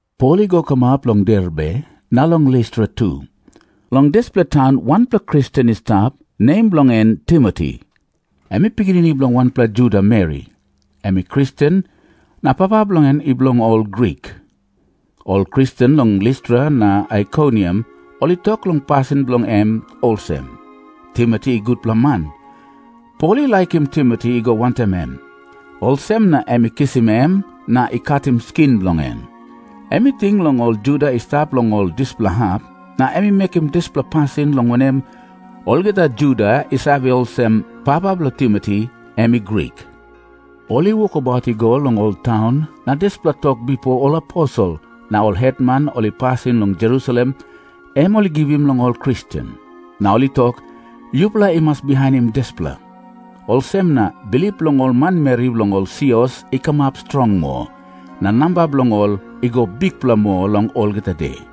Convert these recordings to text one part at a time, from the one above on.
Pol i go kamap long Derbe na long Listra tu. Long dispela taun wanpela Kristen i stap, nem bilong en Timoti. Em i pikinini bilong wanpela Juda meri, em i Kristen. Na papa bilong en i bilong ol Grik. Ol Kristen long Listra na Aikoniam ol i tok long pasin bilong em olsem, Timoti i gutpela man. Pol i laikim Timoti i go wantaim em. Olsem na em i kisim em na i katim skin bilong en. Em i ting long ol Juda i stap long ol dispela hap, na em i mekim dispela pasin, long wanem, olgeta Juda i save olsem, papa bilong Timoti em i Grik. Ol i wokabaut i go long ol taun, na dispela tok bipo ol aposel na ol hetman ol i pasim long Jerusalem, em ol i givim long ol Kristen. Na ol i tok, “Yupela i mas bihainim dispela.” Olsem na bilip bilong ol manmeri bilong ol sios i kamap strong moa, na namba bilong ol i go bikpela moa long olgeta de.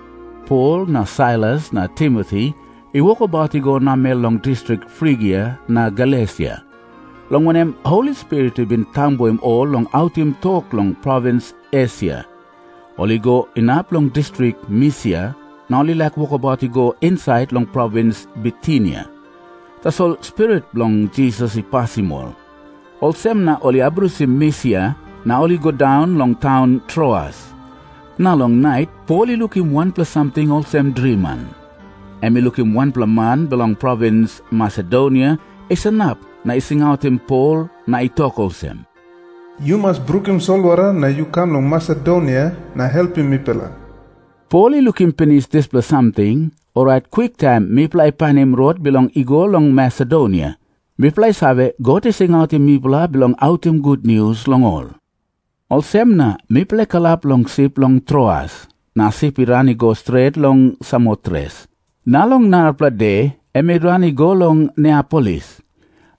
Pol na Sailas na Timoti i wokabaut i go namel long distrik Frigia na Galesia, long wanem, Holi Spirit i bin tambuim ol long autim tok long provins Esia. Ol i go inap long distrik Misia, na ol i laik wokabaut i go insait long provins Bitinia, tasol Spirit bilong Jisas i pasim ol. Olsem na ol i abrusim Misia na ol i go daun long taun Troas. Na long nait Pol i lukim wanpela samting olsem driman. Em i lukim wanpela man bilong provins Masedonia i sanap na i singautim Pol na i tok olsem, “Yu mas brukim solwara na yu kam long Masedonia na helpim mipela.” Pol i lukim pinis dispela samting, orait kwiktaim mipela i painim rot bilong i go long Masedonia. Mipela i save, God i singautim mipela bilong autim gutnius long ol. Olsem na mipela i kalap long sip long Troas, na sip i ran i go stret long Samotres. Na long narapela de em i ran i go long Neapolis.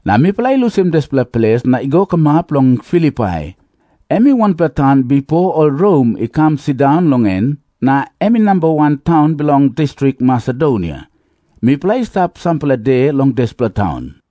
Na mipela i lusim dispela ples na i go kamap long Filipai. Em i wanpela taun bipo ol Rom i kam sindaun long en, na em i namba wan taun bilong distrik Masedonia. Mipela i stap sampela de long dispela taun.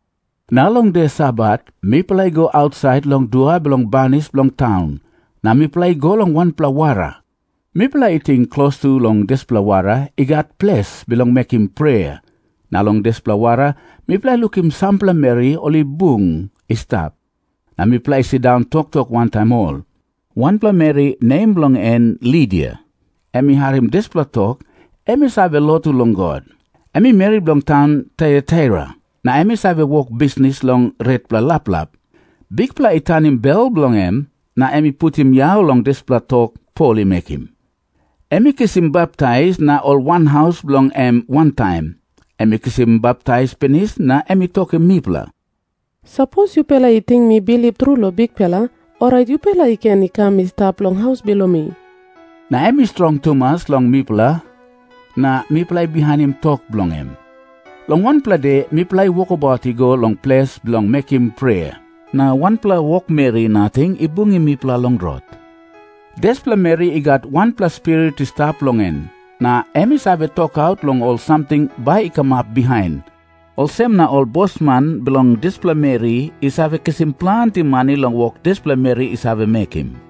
Na long de Sabat mipela i go ausait long dua bilong banis bilong taun, na mipela i go long wanpela wara. Mipela i ting klostu long dispela wara i gat ples bilong mekim prea. Na long dispela wara mipela i lukim sampela meri ol i bung i stap, na mipela i sindaun toktok wantaim ol. Wanpela meri, nem bilong en Lidia, em i harim dispela tok. Em i save lotu long God. Em i meri bilong taun Taiataira, na em i save wok bisnis long retpela laplap. Bikpela i tanim bel bilong em, na em i putim yau long dispela tok Pol i mekim. Em i kisim baptais, na ol wanhaus bilong en wantaim. Em i kisim baptais pinis, na em i tokim mipela, “Sapos yupela i ting mi bilip tru long Bikpela, orait yupela i ken i kam i stap long haus bilong mi.” Na em i strong tumas long mipela, na mipela i bihainim tok bilong em. Long wanpela de mipela i wokabaut i go long ples bilong mekim prea, na wanpela wokmeri nating i bungim mipela long rot. Dispela meri i gat wanpela spirit i stap long en, na em i save tokaut long ol samting bai i kamap bihain. Olsem na ol bosman bilong dispela meri i save kisim planti mani long wok dispela meri i save mekim.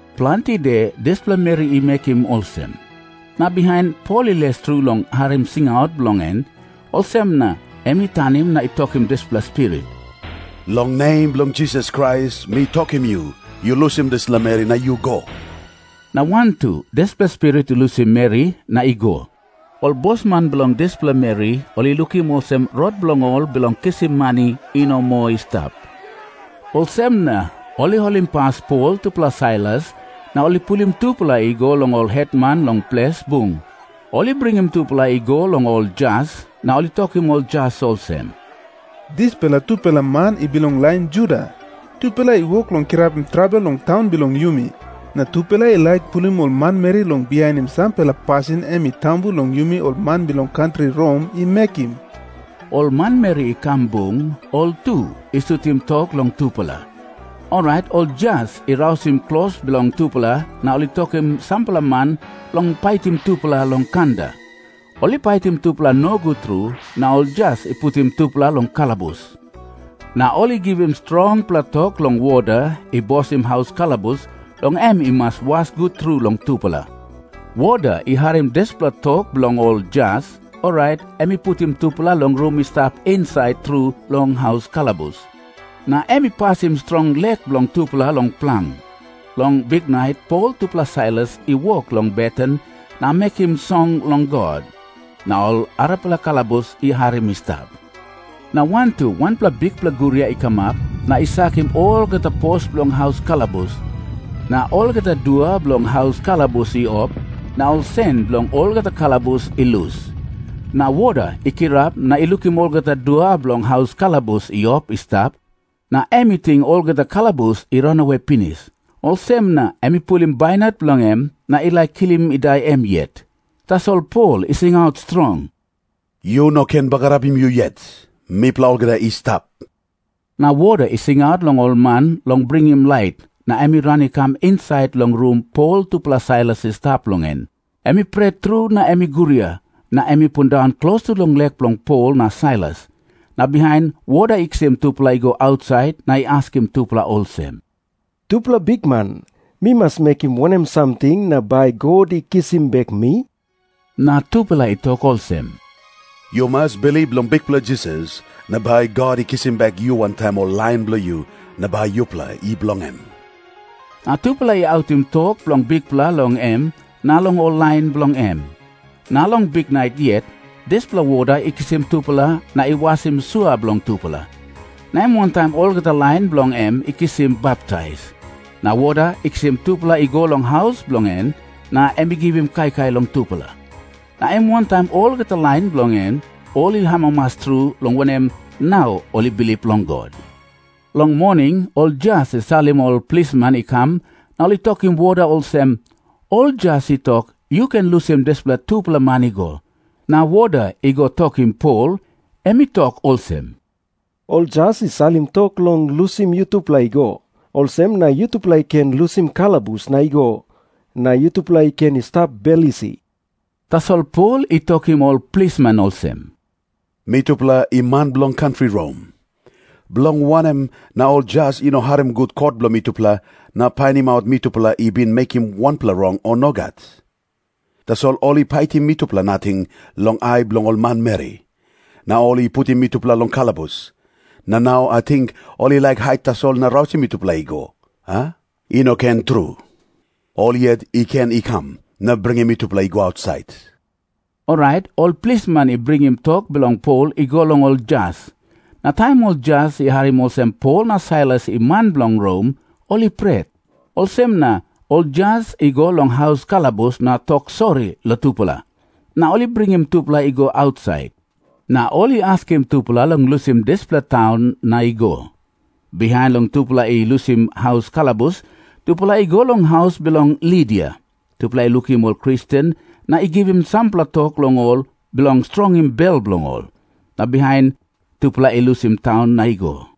Planti de dispela meri i mekim olsem. Na bihain Pol i les tru long harim singaut bilong en, olsem na em i tanim na i tokim dispela spirit, “Long nem bilong Jisas Krais, mi tokim yu, yu lusim dispela meri na yu go.” Na wantu dispela spirit i lusim meri na i go. Ol bosman bilong dispela meri ol i lukim olsem rot bilong ol bilong kisim mani i no moa i stap. Olsem na ol i holimpas Pol tupela Sailas, na ol i pulim tupela i go long ol hetman long ples bung. Ol i bringim tupela i go long ol jas, na ol i tokim ol jas olsem, “Dispela tupela man i bilong lain Juda. Tupela i wok long kirapim trabel long taun bilong yumi. Na tupela i laik pulim ol manmeri long bihainim sampela pasin em i tambu long yumi ol man bilong kantri Rom i mekim.” Ol manmeri i kam bung, ol tu i sutim tok long tupela. Orait ol jas i rausim klos bilong tupela na ol i tokim sampela man long paitim tupela long kanda. Ol i paitim tupela nogut tru, na ol jas i putim tupela long kalabus. Na ol i givim strongpela tok long woda i bosim haus kalabus, long em i mas was gut tru long tupela. Woda i harim dispela tok bilong ol jas, orait em i putim tupela long rum i stap insait tru long haus kalabus. Na em i pasim strong lek bilong tupela long plang. Long biknait Pol tupela Sailas i wok long beten na mekim song long God. Na ol arapela kalabus i harim i stap. Na wantu wanpela bikpela guria i kamap, na i sakim olgeta pos bilong haus kalabus. Na olgeta dua bilong haus kalabus i op, na ol sen bilong olgeta kalabus i lus. Na woda i kirap na i lukim olgeta dua bilong haus kalabus i op i stap, na em i ting olgeta kalabus i ranawe pinis. Olsem na em i pulim bainat bilong en na i laik kilim i dai em yet. Tasol Pol i singaut strong, “Yu no ken bagarapim yu yet. Mipela olgeta i stap.” Na woda i singaut long ol man long bringim lait, na em i ran i kam insait long rum Pol tupela Sailas i stap long en. Em i pret tru na em i guria, na em i pundaun klostu long lek bilong Pol na Sailas. Na bihain woda i kisim tupela i go ausait, na i askim tupela olsem, “Tupela bikman, mi mas mekim wanem samting na bai God i kisim bek mi?” Na tupela i tok olsem, “Yu mas bilip long Bikpela Jisas, na bai God i kisim bek yu wantaim ol lain bilong yu, na bai yupela i bilong em.” Na tupela i autim tok bilong Bikpela long em na long ol lain bilong em. Na long biknait yet, dispela woda i kisim tupela na i wasim sua bilong tupela. Na em wantaim olgeta lain bilong en i kisim baptais. Na woda i kisim tupela i go long haus bilong en, na em i givim kaikai long tupela. Na em wantaim olgeta lain bilong en, ol i amamas tru, long wanem, nau ol i bilip long God. Long moning ol jas i salim ol plisman i kam, na ol i tokim woda olsem, “Ol jas i tok, yu ken lusim dispela tupela man i go.” Na woda i go tokim Pol. Em i tok olsem, “Ol jas i salim tok long lusim yutupela i go. Olsem na yutupela i ken lusim kalabus na i go, na yutupela i ken i stap bel isi.” Tasol Pol i tokim ol plisman olsem, “Mitupela i man bilong kantri Rom. Bilong wanem na ol jas i no harim gut kot bilong mitupela na painimaut mitupela i bin mekim wanpela rong, o nogat? Tasol ol i paitim mitupela nating long ai bilong ol manmeri. Na ol i putim mitupela long kalabus. Na nau ating ol i laik hait tasol na rausim mitupela i go, a? I no ken tru. Ol yet i ken i kam na bringim mitupela i go ausait.” Orait ol plisman i bringim tok bilong Pol i go long ol jas. Na taim ol jas i harim olsem Pol na Sailas i man bilong Rom, ol i pret. Olsem na ol jas i go long haus kalabus na tok sori long tupela, na ol i bringim tupela i go ausait. Na ol i askim tupela long lusim dispela taun na i go. Bihain long tupela i lusim haus kalabus, tupela i go long haus bilong Lidia. Tupela i lukim ol Kristen na i givim sampela tok long ol bilong strongim bel bilong ol. Na bihain tupela i lusim taun na i go.